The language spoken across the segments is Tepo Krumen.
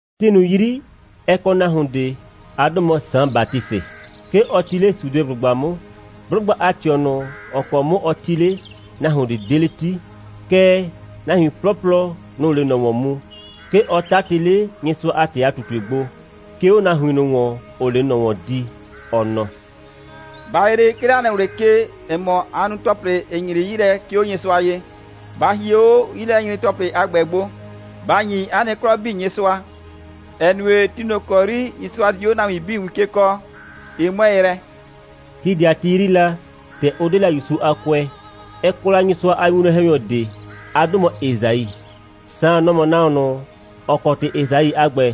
Ti ꞊nʋ 'yri, ɛ kɔ nahuon ꞊de. 'A 'dʋ mɔ Saan Batisɩ. 'Ke ɔ 'ti 'le Sudeblʋgba 'mʋ. 'Blʋgba a ꞊tɩɔ ꞊nʋ, ‑ɔ kɔ 'mʋ ɔ 'ti 'le, nahuon ꞊de 'de 'le 'ti, kɛɛ, nahuin 'plɔplɔ, nʋ‑ʋ 'le ꞊nɔ ‑wɔn mu. 'Ke ɔ 'tatɩ 'le Nyɩsʋa a ‑tɩ a ꞊tutue gbo, 'ke 'o nahuin ꞊nʋ ‑wɔn, ‑ʋʋ 'le ꞊nɔ ‑wɔn di, ɔ nɔ: «Ba yree, 'ke 'le 'a nɩ ꞊wlɩ ke, ‑ɛ mɔ, aa nu ‑tɔplɩ, ‑ɩ nyre 'yi lɛ, 'ke 'o Nyɩsʋa ye. Ba hie 'o 'yilɛnyre‑tɔplɩ a ‑gbɛ gbo, ba ‑nyi 'a nɩ 'klɔ 'bii Nyɩsʋa, ‑ɛ nue, ti ꞊nʋ ‑kɔ 'yri Nyɩsʋa di 'o nahuin 'bii win ke kɔɔ, ɩ 'mʋɛɛ yrɛ.» Ti ꞊de a ti 'yri la, ‑tɛ ʋ 'de la ‑Yusu a kʋɛ, ɛ kɔ la Nyɩsʋa a winwlɔn‑hɛnyɔ ꞊de. 'A 'dʋ mɔ Esai. Saan, nɔ‑ mɔ nahuon ꞊nʋ, ‑ɔ kɔ ‑tɩ Esai a ‑gbɛ,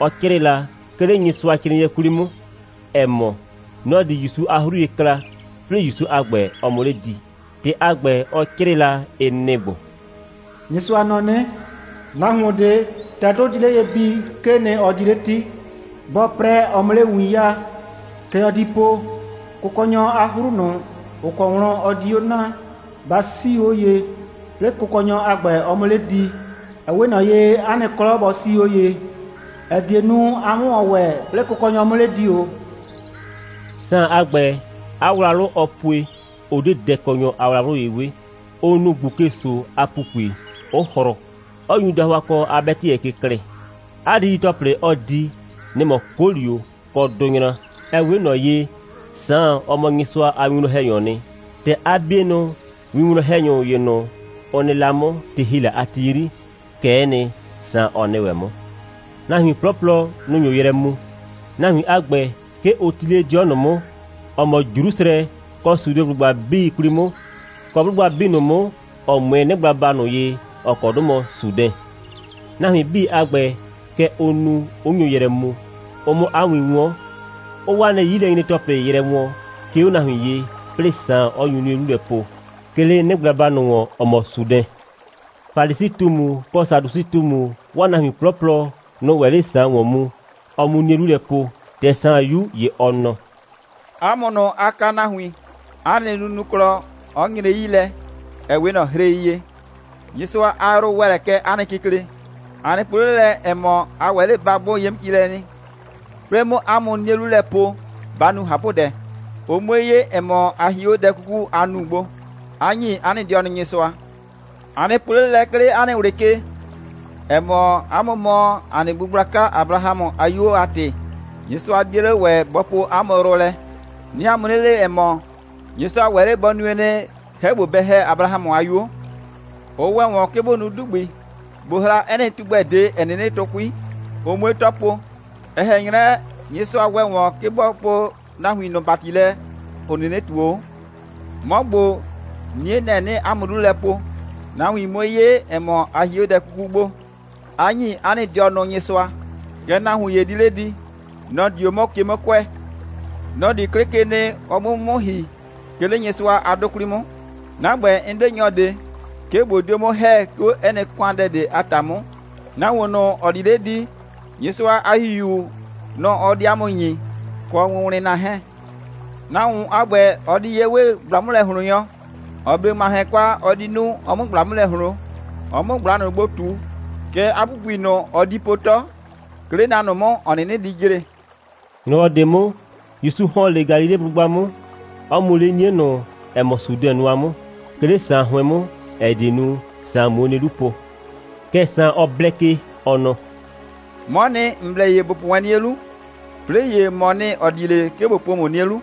ɔ 'crɩɩ la, 'ke 'le Nyɩsʋacrɩɩnɩɛ 'kwli 'mʋ, ‑ɛ mɔ, nɔ‑ di ‑Yusu a 'hru ye kla, 'plɩɩ ‑Yusu a ‑gbɛ, ɔ 'mʋ 'le di. ‑Tɩ a ‑gbɛ, ɔ 'crɩɩ la, ɩ nɩ‑ ‑gbo: «Nyɩsʋa nɔ 'nɩ: Nahuon ꞊de, ‑tɛ 'dʋ di 'le ye bii, 'kee nɩ, ɔ di 'le 'ti. 'Bɔɔ 'prɛ, ɔ 'mʋ 'le win 'yaa. Kɛ ɔ di po: Kʋkɔnyɔ a 'hru ꞊nʋ, ‑ʋ kɔ wlɔn ɔ di 'o na, ba 'siu 'o ye, 'plɩɩ Kʋkɔnyɔ a ‑gbɛ, ɔ 'mʋ 'le di. Ɛ 'we ꞊nɔ ye, 'a nɩ 'klɔ bɔ 'sii 'o ye, ‑ɛ die nu, a 'mʋ ‑wɔn ‑wɛ, 'plɩɩ Kʋkɔnyɔ 'mʋ 'le di ‑o.» Saan a ‑gbɛ, 'a wlawlʋ, ɔɔ pue, ʋ 'de dɛkɔnyɔ a wlawlʋ ye 'we. Ʋ nu ꞊gbuke‑so a ‑pupui, 'ʋ hrʋ, 'ɔ nyu dahʋakɔ a 'bɛtɩyɛ ke klɩɩ. 'A didi‑tɔplɩ, ɔɔ di, nɩ‑ mɔ 'kolio kɔ dʋnyra. (Ɛ 'we ꞊nɔ ye, Saan, ɔ mɔ Nyɩsʋa a winwlɔn‑hɛnyɔɔ nɩ. ‑Tɛ 'a 'bienʋ winwlɔn‑hɛnyʋ ‑ye ꞊nʋ, ʋ nɩ la 'mʋ, ti ‑hi la a ti 'yri, kɛ'ɛ nɩ, Saan, ɔ nɩ ‑wɛ 'mʋ.) Nahuin 'plɔplɔ, nʋ‑ nyo yrɛ mu. Nahuin a ‑gbɛ, 'ke ʋ 'ti 'le 'dɩɔ ꞊nʋ 'mʋ, ‑ɔ mɔ Jrusrɛ, kɔ Sudeblʋgba 'bii 'kwli 'mʋ, kɔ 'blʋgba 'bii ꞊nʋ 'mʋ, ‑ɔ 'mʋɛɛ 'nɩgblaba ꞊nʋ ye, ‑ɔ kɔ 'dʋ mɔ Sudɛn. Nahuin 'bii a ‑gbɛ, kɛ ʋʋ nu, 'ʋ nyo yrɛ mu, ʋ 'mʋ 'a win 'wɔn, 'ʋʋ 'waa nɩ 'yilɛnyre‑tɔplɩ yrɛ wɔɔn, 'ke 'o nahuin ye, 'plɩɩ Saan, 'ɔ nyu 'nie 'lu lɛ po, 'ke 'le 'nɩgblaba ꞊nʋ ‑wɔn, ‑ɔ mɔ Sudɛn. Falisi꞊tumu kɔ Sadusɩ꞊tumu, 'waa nahuin 'plɔplɔ, nʋ‑ʋ ‑wɛ 'le Saan ‑wɔn mu, ɔ 'mu 'nie 'lu lɛ po. ‑Tɛ Saan 'yu, ‑ye ɔ nɔ: «'A mʋ ꞊nʋ, aa kaa nahuin, 'a nɩ nunuklɔ 'ɔ nyre 'yi lɛ, ‑ɛ 'we ꞊nɔ hrei ye. Nyɩsʋa a yrʋ ‑wɛ lɛ kɛ 'a nɩ kikle. A nɩ po 'le lɛ, ‑ɛ mɔ, a ‑wɛ 'le ba 'gbʋ ye 'mʋ ci lɛ nɩ. 'Plɩɩ 'mʋ 'a mʋ 'nie 'lu lɛ po, ba nu ꞊hapʋdɛ, ʋ 'mue 'ye, ‑ɛ mɔ, a hie 'o dɛ 'kuku, aa nu gbo, 'a ‑nyi 'a nɩ dɩɔnʋ Nyɩsʋa. A nɩ po 'le lɛ, 'ke 'le 'a nɩ ꞊wlɩ ke, ‑ɛ mɔ, 'a mʋ mɔ ‑a nɩ bu gblaka Abrahamʋ a 'yuo, 'a ‑tɩ, Nyɩsʋa 'die 'le ‑wɛ bɔ poo 'a mʋ yrʋ lɛ. 'Nɩɩ 'a mʋ 'nɩ le, ‑ɛ mɔ, Nyɩsʋa ‑wɛ 'le bɔ nue nɩ, 'hɛ ‑gbo, bɛ ‑hɛ Abrahamʋ a 'yuo. Ʋ ‑wɛ ‑wɔn, 'ke bʋ nu 'dugbi, bʋ hra 'ɛ nɩ tugbɛ ꞊de, ‑ɛ 'nɩnɩ tʋ 'kui, ʋ 'mue 'tɔ po. Ɛ ꞊hɛn 'nyrɛ, Nyɩsʋa ‑wɛ ‑wɔn, 'ke bɔ poo nahuin ꞊nʋ ‑bati lɛ, ‑ʋ 'nɩnɩ ꞊tuo 'o. 'Mɔ ‑gbo, 'nie, nɛ‑ 'nɩɩ 'a mʋ 'lu lɛ po, nahuin 'mue 'ye, ‑ɛ mɔ, a hie 'o dɛ 'kuku gbo, 'a ‑nyi 'a nɩ dɩɔnʋ Nyɩsʋa. Kɛɛ, nahuon ‑ye di 'le di. Nɔ‑ di 'o 'mʋ ke 'mʋ kʋɛ. Nɔ‑ di 'klɩ ke nɩ, ɔ 'mʋ 'o 'mʋ 'mʋ ‑hi, 'ke 'le Nyɩsʋa a 'dʋ 'kwli 'mʋ. 'Na ‑gbɛ, 'n 'de nyɔ ꞊de, 'ke ꞊bo dio 'mʋ ‑hɛ, 'ke 'o 'ɛ nɩ ‑kʋandɛ ꞊de a ‑ta 'mʋ. Nahuon ꞊nʋ, ‑ɔ di 'le di, Nyɩsʋa a ‑Hihiu, nʋ‑ ɔ di 'a mʋ ‑nyi, kɔ wʋnwlɩnna 'hɛɛn. Nahuon a ‑gbɛ, ɔ di ye 'we ꞊gbla'mʋlɛ꞊hloonnyɔ, ‑ɔ 'ble ‑ŋmahɛn kwa, ɔ di nu, ɔ 'mʋ ꞊gbla 'mʋ lɛ ꞊hloon, ɔ 'mʋ ꞊gbla ꞊nʋ gbo ꞊tu. Kɛɛ, 'a ‑pupui ꞊nʋ, ɔ di po 'tɔ, 'ke 'le na ꞊nʋ 'mʋ, ‑ɔ 'nɩnɩ di jre.» ‑Nyrɔwɔ ꞊de 'mʋ, ‑Yusu ‑hɔn 'le Galileblʋgba 'mʋ, 'ɔ mu 'le 'nie ꞊nʋ, ‑ɛ mɔ Sudɛn nʋa 'mʋ, 'ke 'le Saan 'hʋɩn 'mʋ, ‑ɛ die nu, Saan 'muo 'nie 'lu po. Kɛɛ, Saan, ɔ blɛ ke, ɔ nɔ: «'Mɔɔ nɩ, ‑n blɛ ye ‑bo po wɛn 'nie 'lu, 'plɩɩ ‑ye, ‑mɔɔ nɩ, ‑ɔ di 'le, 'ke ꞊bo po ‑mʋ 'nie 'lu.»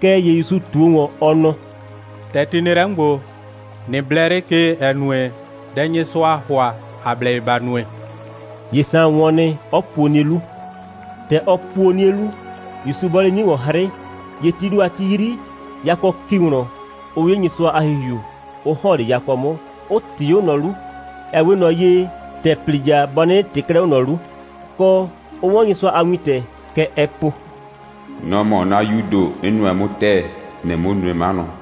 Kɛɛ ‑ye ‑Yusu ꞊tuo ‑wɔn, ɔ nɔ: «‑Tɛ ti nɩ lɛ 'mʋ ‑gbo, ꞊nɩ blɛ 'le ke, ‑ɛ nue, dɛ Nyɩsʋaa ‑hʋa, ‑a blɛ ye ‑ba nue.» ‑Ye Saan wɔn nɩ, 'ɔ puo 'nie 'lu. ‑Tɛ ɔ puo 'nie 'lu, ‑Yusu bɔɔ 'le 'nie ‑wɔn 'hrɩ, ‑ye tii ‑do a ti 'yri, yakɔ ‑ki wlɔn, 'ɔ 'ye Nyɩsʋa a ‑Hihiu, 'ʋ ‑hɔn 'le yakɔ 'mʋ, 'ʋ ꞊tɩɩ 'o ꞊nɔ 'lu, ɛ 'we ꞊nɔ ye, ‑tɛ ‑plija bɔ 'nɩnɩ ꞊tɩɩ 'klɛɛ 'o ꞊nɔ 'lu, kɔ, ʋ 'wɔn Nyɩsʋa a wintɛ. Kɛ ɛɛ po: «Nɔ‑ mɔ 'na 'Yuu ‑do, 'n nʋɛ 'mʋ ‑tɛɛ. ‑Nɩɩ 'mʋ nue 'manʋ.»